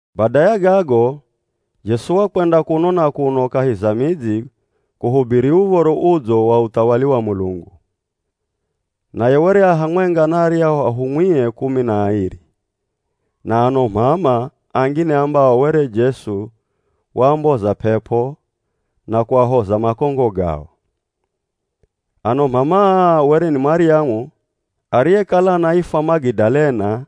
Bada ya gago, Jesu wakwenda kuno na kuno kahi za midzi kuhubiri Uv̱oro Udzo wa uthawali wa Mulungu. Naye were a hamwenga na aryahu ahumwie kumi na airi, na ano m'ama angine ambao were Jesu waamboza p'ep'o na kuahoza makongo gao. Ano m'ama aa were ni Maryamu (ariyekala anaifwa Magidalena)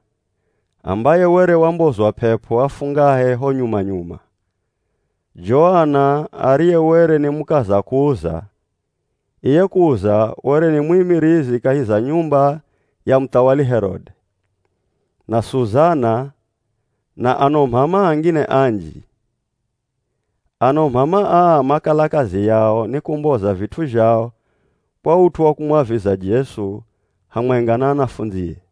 ambaye were wambozwa p'ep'o afungahe ho nyuma-nyuma, Joana ariye were ni mukaza Kuza, (iye Kuza were ni mwimirizi kahi za nyumba ya muthawali Herode), na Suzana, na ano m'ama angine anji. Ano m'ama aa makala kazi yao ni kumboza vit'u zhao kwa ut'u wa kumwaviza Jesu hamwenga na anafundzie.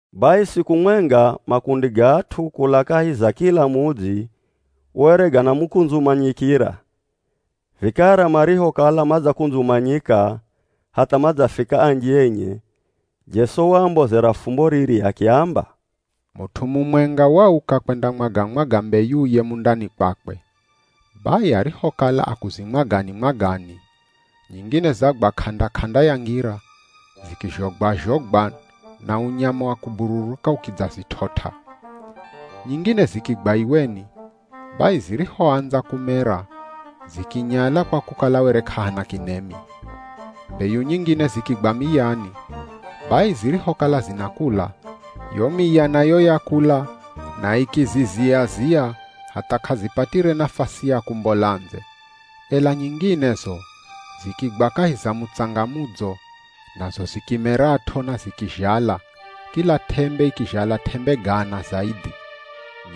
Bai siku mwenga makundi ga at'u kula kahi za kila mudzi were ganamukundzumanyikira, vikara marihokala madzakundzumanyika hatha madzafika anji enye, Jesu waambozera fumbo riri akiamba, “Mut'u mumwenga wauka kwendamwaga-mwaga mbeyuye mundani kwakwe. Bai arihokala akuzimwagani-mwagani, nyingine zagwa k'anda-k'anda ya ngira, zikizhogwa-zhogwa na unyama wa kubururuka ukidzazit'ot'a. Nyingine zikigwa iweni, bai zirihoandza kumera zikinyala kwa kukala were k'ahana kinemi. Mbeyu nyingine zikigwa miyani, bai zirihokala zinakula, yo miya nayo yakula na ikizizia-zia hatha k'azipatire nafasi ya kumbola ndze. Ela nyinginezo zikigwa kahi za mutsanga mudzo, nazo zikimerat'o na zikizhala, kila t'embe ikizhala t'embe gana zaidhi.”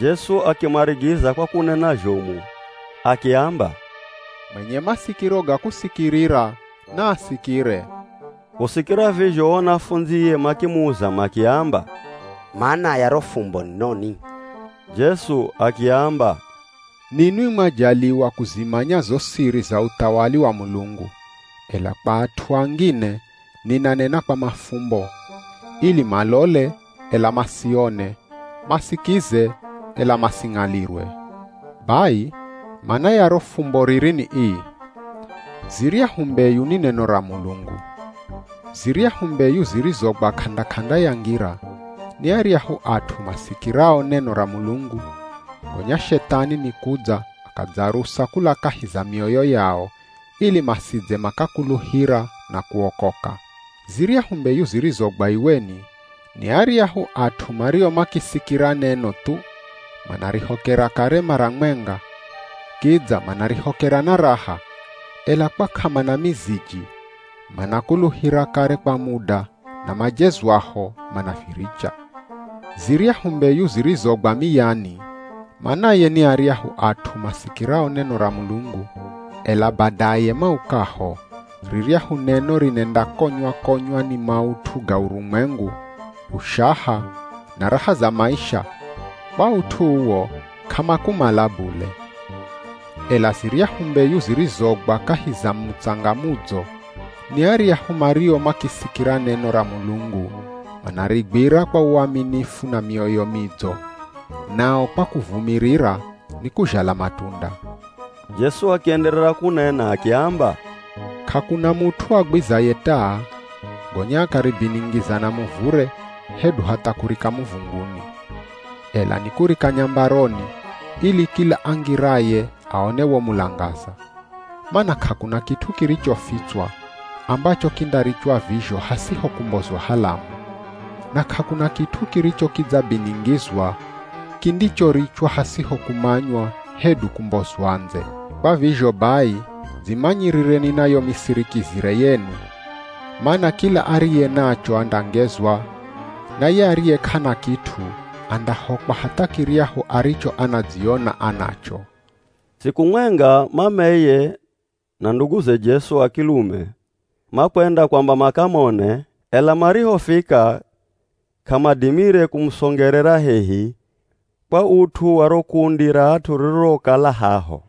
Jesu akimarigiza kwa kunena zhomu akiamba, “Mwenye masikiro ga kusikirira, naasikire.” Kusikira vizho o anafundzie makimuza makiamba, “Mana ya ro fumbo ni noni?” Jesu akiamba, “Ninwi mwajaliwa kuzimanya zo siri za uthawali wa Mulungu, ela kwa at'u angine ninanena kwa mafumbo, ili ‘malole, ela masione, masikize, ela masing'alirwe.’” “Bai mana ya ro fumbo riri ni ii: Ziryahu mbeyu ni neno ra Mulungu. Ziryahu mbeyu zirizogwa k'anda-k'anda ya ngira ni aryahu at'u masikirao neno ra Mulungu, gonya Shethani nikudza akadzarusa kula kahi za mioyo yao, ili masidze makakuluhira na kuokoka. Ziryahu mbeyu zirizogwa iweni, ni aryahu at'u mario makisikira neno thu, manarihokera kare mara mwenga, kidza manarihokera na raha, ela kwa k'amana miziji, manakuluhira kare kwa muda na majezwaho, manaviricha. Ziryahu mbeyu zirizogwa miyani manaye ni aryahu at'u masikirao neno ra Mulungu, ela badaye maukaho, riryahu neno rinendakonywa-konywa ni maut'u ga urumwengu, ushaha, na raha za maisha, kwa ut'u uwo, k'amakumala bule. Ela ziryahu mbeyu zirizogwa kahi za mutsanga mudzo, ni aryahu mario makisikira neno ra Mulungu manarigwira kwa uaminifu na mioyo midzo, nao kwa kuvumirira ni kuzhala matunda.” Jesu akienderera kunena akiamba, “K'akuna mut'u agwizaye taa, gonya akaribiningiza na muvure hedu hatha kurika muvunguni. Ela nikurika nyambaroni, ili kila angiraye aone wo mulangaza. Mana k'akuna kit'u kirichofitswa, ambacho kindarichwa vizho hasiho kumbozwa halamu, na k'akuna kit'u kiricho kidzabiningizwa, kindichorichwa hasiho kumanywa hedu kumbozwa ndze. Kwa vizho bai, dzimanyirireni na yo misirikizire yenu. Mana kila ariye nacho andangezwa, na ye ariye k'ana kit'u, andahokwa hatha kiryahu aricho anadziona anacho.” Siku mwenga mameye, na nduguze Jesu a kilume, makwenda kwamba makamone, ela marihofika k'amadimire kumusongerera hehi kwa ut'u wa ro kundi ra at'u ririrokala haho.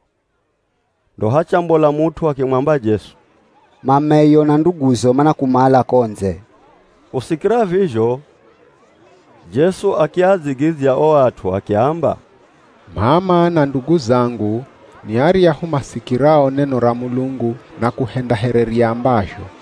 Ndo hachambola mut'u akimwamba Jesu, “Mameyo na nduguzo manakumala ko ndze.” Kusikira vizho Jesu akiadzigidzya o at'u akiamba, “M'ama na ndugu zangu, ni aryahu masikirao neno ra Mulungu na kuhenda here riambazho.”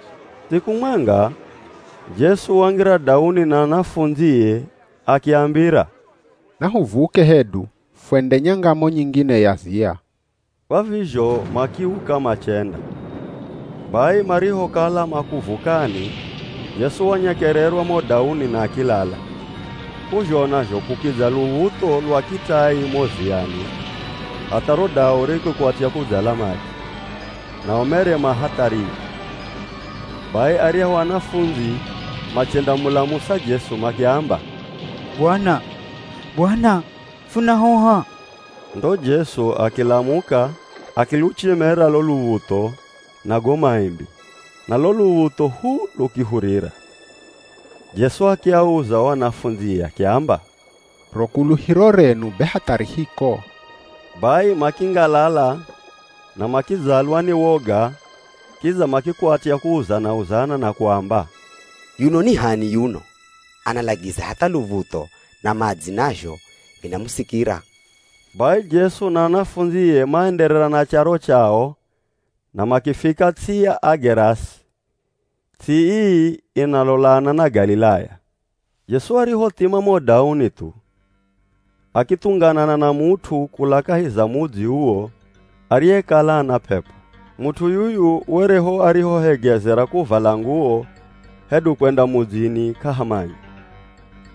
Siku mwenga, Jesu wangira dauni na anafundzie akiambira, “Nahuvuke hedu fwende nyangamo nyingine ya ziya.” Kwa vizho makiuka machenda. Bai marihokala makuvukani, Jesu wanyekererwa mo dauni na akilala. K'uzhona zho kukidza luv̱utho lwa kitai mo ziyani hatha ro dau rikikwatya kudzala madzi, nao mere ma hatharini. Bai aryahu anafundzi machendamulamusa Jesu makiamba, “Bwana! Bwana! Funahoha!” Ndo Jesu akilamuka akiluchemera lo luv̱utho na go maimbi, na lo luv̱utho hu lukihurira. Jesu akiauza o anafundzie akiamba, “Ro kuluhiro renu be hatha ri hiko?” Bai makingalala na makidzalwa ni woga kidza makikwatya kuuzana-uzana na kuamba, “Yuno ni h'ani yuno? Analagiza hatha luv̱utho na madzi nazho vinamusikira.” Bai Jesu na anafundzie maenderera na charo chao na makifika ts'i ya Agerasi. Ts'i ii inalolana na Galilaya. Jesu arihothima mo dauni thu, akithunganana na mut'u kula kahi za mudzi uwo ariyekala ana p'ep'o. Mut'u yuyu were ho arihohegezera kuvala nguwo hedu kwenda mudzini k'ahamanya,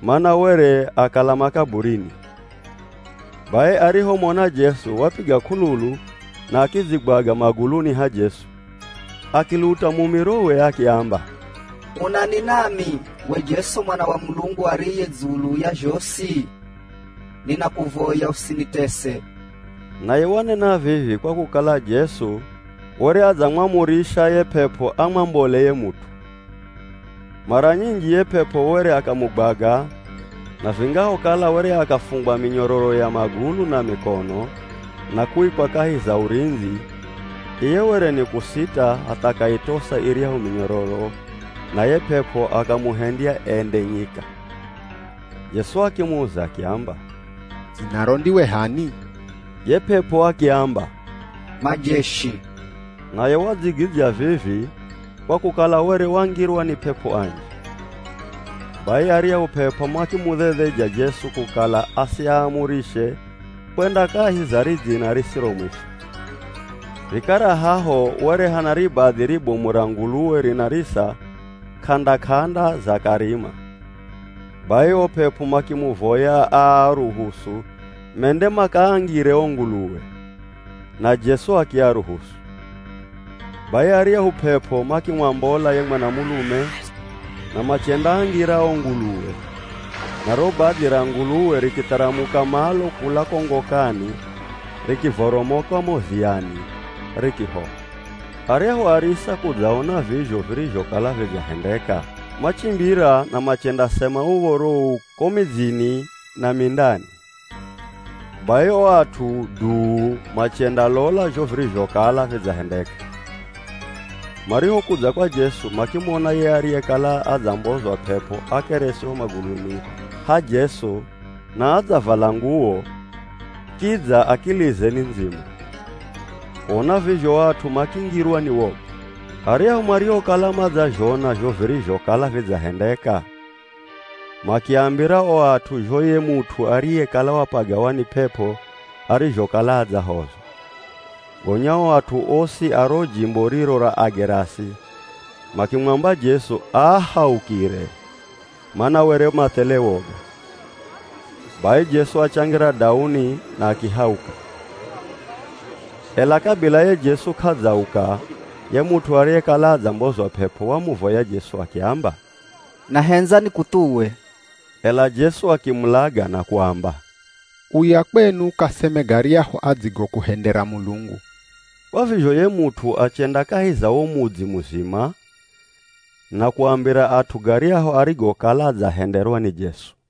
mana were akala makaburini. Bai arihomona Jesu, wapiga k'ululu na akidzigwaga maguluni ha Jesu, akiluta mumirowe akiamba, “Unani nami we Jesu Mwana wa Mulungu ariye dzulu ya zhosi? Ninakuvoya usinitese.” Naye wanena vivi kwa kukala Jesu were adzamwamurisha ye p'ep'o amwambole ye mut'u. Mara nyinji ye p'ep'o were akamugwaga na vingahokala were akafungwa minyororo ya magulu na mikono na kuikwa kahi za urindzi, iye were ni kusita hatha akaitosa iryahu minyororo na ye p'ep'o akamuhendya ende nyika. Jesu akimuza akiamba, “Dzinaro ndiwe h'ani?” Ye p'ep'o akiamba, “Majeshi.” Naye wadzigidzya vivi kwa kukala were wangirwa ni p'ep'o anji. Bai aryahu p'ep'o makimudhedheja Jesu kukala asiaamurishe kwenda kahi za ridzina risiro mwisho. Vikara haho were hana ribadhi ribomu ra nguluwe rinarisa k'anda-k'anda za karima. Bai o p'ep'o makimuvoya aaruhusu mende makaangire o nguluwe, na Jesu akiaruhusu. Bai aryahu p'ep'o makimwambola ye mwanamulume, na machendaangira o nguluwe, na ro badhi ra nguluwe rikitharamuka malo kula ko ngokani rikivoromoka mo ziyani rikihoha. Aryahu arisa kudzaona vizho virizhokala vidzahendeka, machimbira na machendasema uv̱oro uu ko midzini na mindani. Bai o at'u duu machendalola zho virizhokala vidzahendeka. Marihokudza kwa Jesu makimona ye ariyekala adzambozwa p'ep'o akelesi ho maguluni ha Jesu na adzavala nguwo kidza akilize ni ndzima. Kuona vizho o at'u makingirwa ni woga. Aryahu mariokala madzazhona zho virizhokala vidzahendeka, makiambira o at'u zho ye mut'u ariyekala wapagawa ni p'ep'o arizhokala adzahozwa. Gonya o at'u osi a ro jimbo riro ra Agerasi makimwamba Jesu aahaukire, mana were mathele woga. Bai Jesu achangira dauni na akihauka. Ela kabila ye Jesu k'adzauka ye mut'u ariyekala adzambozwa p'ep'o wamuvoya Jesu akiamba, “Nahendza nikuthuwe.” Ela Jesu akimulaga na kuamba, “Uya kwenu ukaseme garyahu adzigokuhendera Mulungu.” Kwa vizho ye mut'u achenda kahi za wo mudzi muzima na kuambira at'u garyahu arigokala adzahenderwa ni Jesu.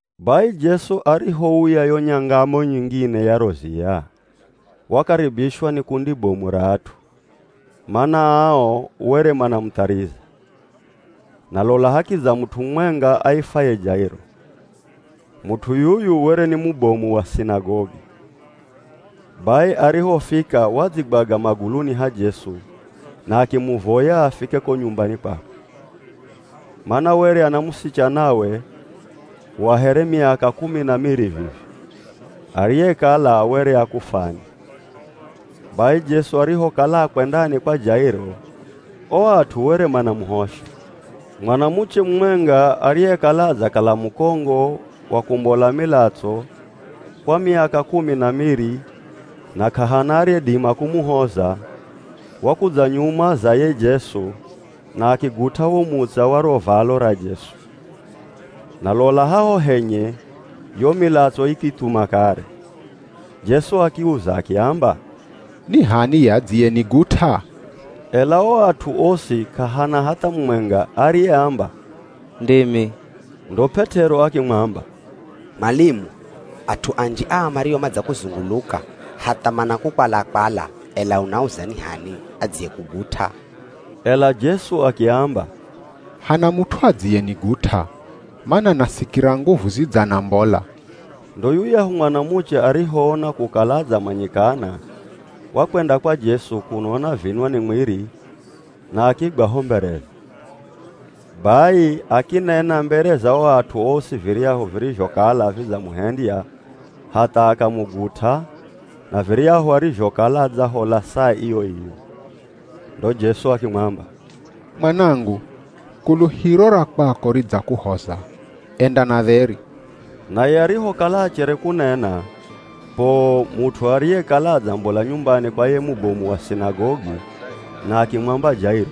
Bai Jesu arihouya yo nyangamo nyingine ya ro ziya, wakaribishwa ni kundi bomu ra at'u, mana ao were manamuthariza. Na lola, hakidza mut'u mumwenga aifwaye Jairo. Mut'u yuyu were ni mubomu wa sinagogi. Bai arihofika wadzigwaga maguluni ha Jesu na akimuvoya afike ko nyumbani kwakwe. Mana were ana musichanawe, wa here miaka kumi na miri vivi, ariyekala were akufwani. Bai Jesu arihokala akwendani kwa Jairo o at'u were manamuhosha. Mwanamuche mumwenga ariyekala adzakala mukongo wa kumbola milatso, kwa miaka kumi na miri na k'ahana ariyedima kumuhoza, wakudza nyuma za ye Jesu na akigut'a wo mutsa wa ro valo ra Jesu, na lola haho henye yo milatso ikithuma kare. Jesu akiuza akiamba, “Ni h'ani ye adziyenigut'a?” Ela o at'u osi k'ahana hatha mumwenga ariyeamba, “Ndimi.” Ndo P'et'ero akimwamba, “Mwalimu, at'u anji aa mario madzakuzunguluka hatha manakukwala-kwala, ela unauza ni h'ani adziyekugut'a!” Ela Jesu akiamba, “Hana mut'u adziyenigut'a, mana nasikira nguvu zidzanambola.” Ndo yuyahu mwanamuche arihoona kukala adzamanyikana wakwenda kwa Jesu kuno anavinwa ni mwiri na akigwa ho mbereze. Bai akinena mbere za o at'u osi viryahu virizhokala vidzamuhendya hatha akamugut'a na viryahu arizhokala adzahola saa iyo-iyo. Ndo Jesu akimwamba, “Mwanangu kuluhiro ra kwako ridzakuhoza. Enda na dheri.” Naye arihokala achere kunena, poo mut'u ariyekala adzambola nyumbani kwa ye mubomu wa sinagogi na akimwamba Jairo,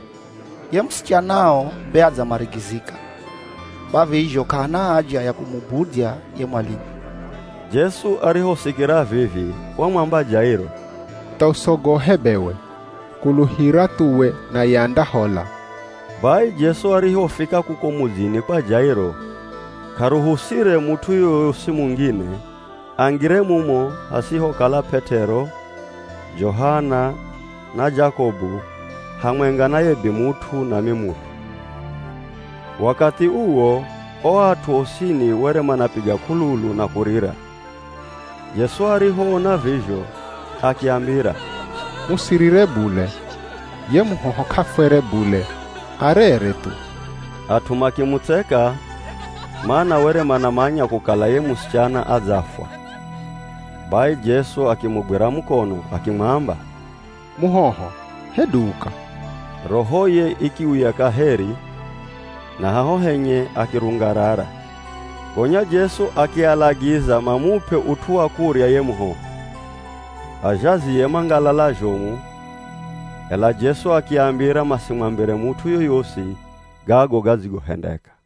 “Ye musichanao be adzamarigizika, kwa vizho k'ahana haja ya kumubudzya ye mwalimu.” Jesu arihosikira vivi wamwamba Jairo, “Tha usogohe bewe, kuluhira thuwe naye andahola.” Bai Jesu arihofika kuko mudzini kwa Jairo, k'aruhusire mut'u yoyosi mungine angire mumo hasihokala P'et'ero, Johana, na Jakobu hamwenga na ye bimut'u na mimut'u. Wakathi uwo o at'u osini were manapiga k'ululu na kurira. Jesu arihoona vizho akiambira, “Musirire bule, ye muhoho k'afwere bule, arere thu.” At'u makimutseka, mana were manamanya kukala ye musichana adzafwa. Bai Jesu akimugwira mukono akimwamba, “Muhoho, hedu uka!” Rohoye ikiuya kaheri na haho henye akirungarara. Gonya Jesu akialagiza mamup'e ut'u wa kurya ye muhoho. Azhazie mangalala zhomu, ela Jesu akiambira masimwambire mut'u yoyosi gago gadzigohendeka.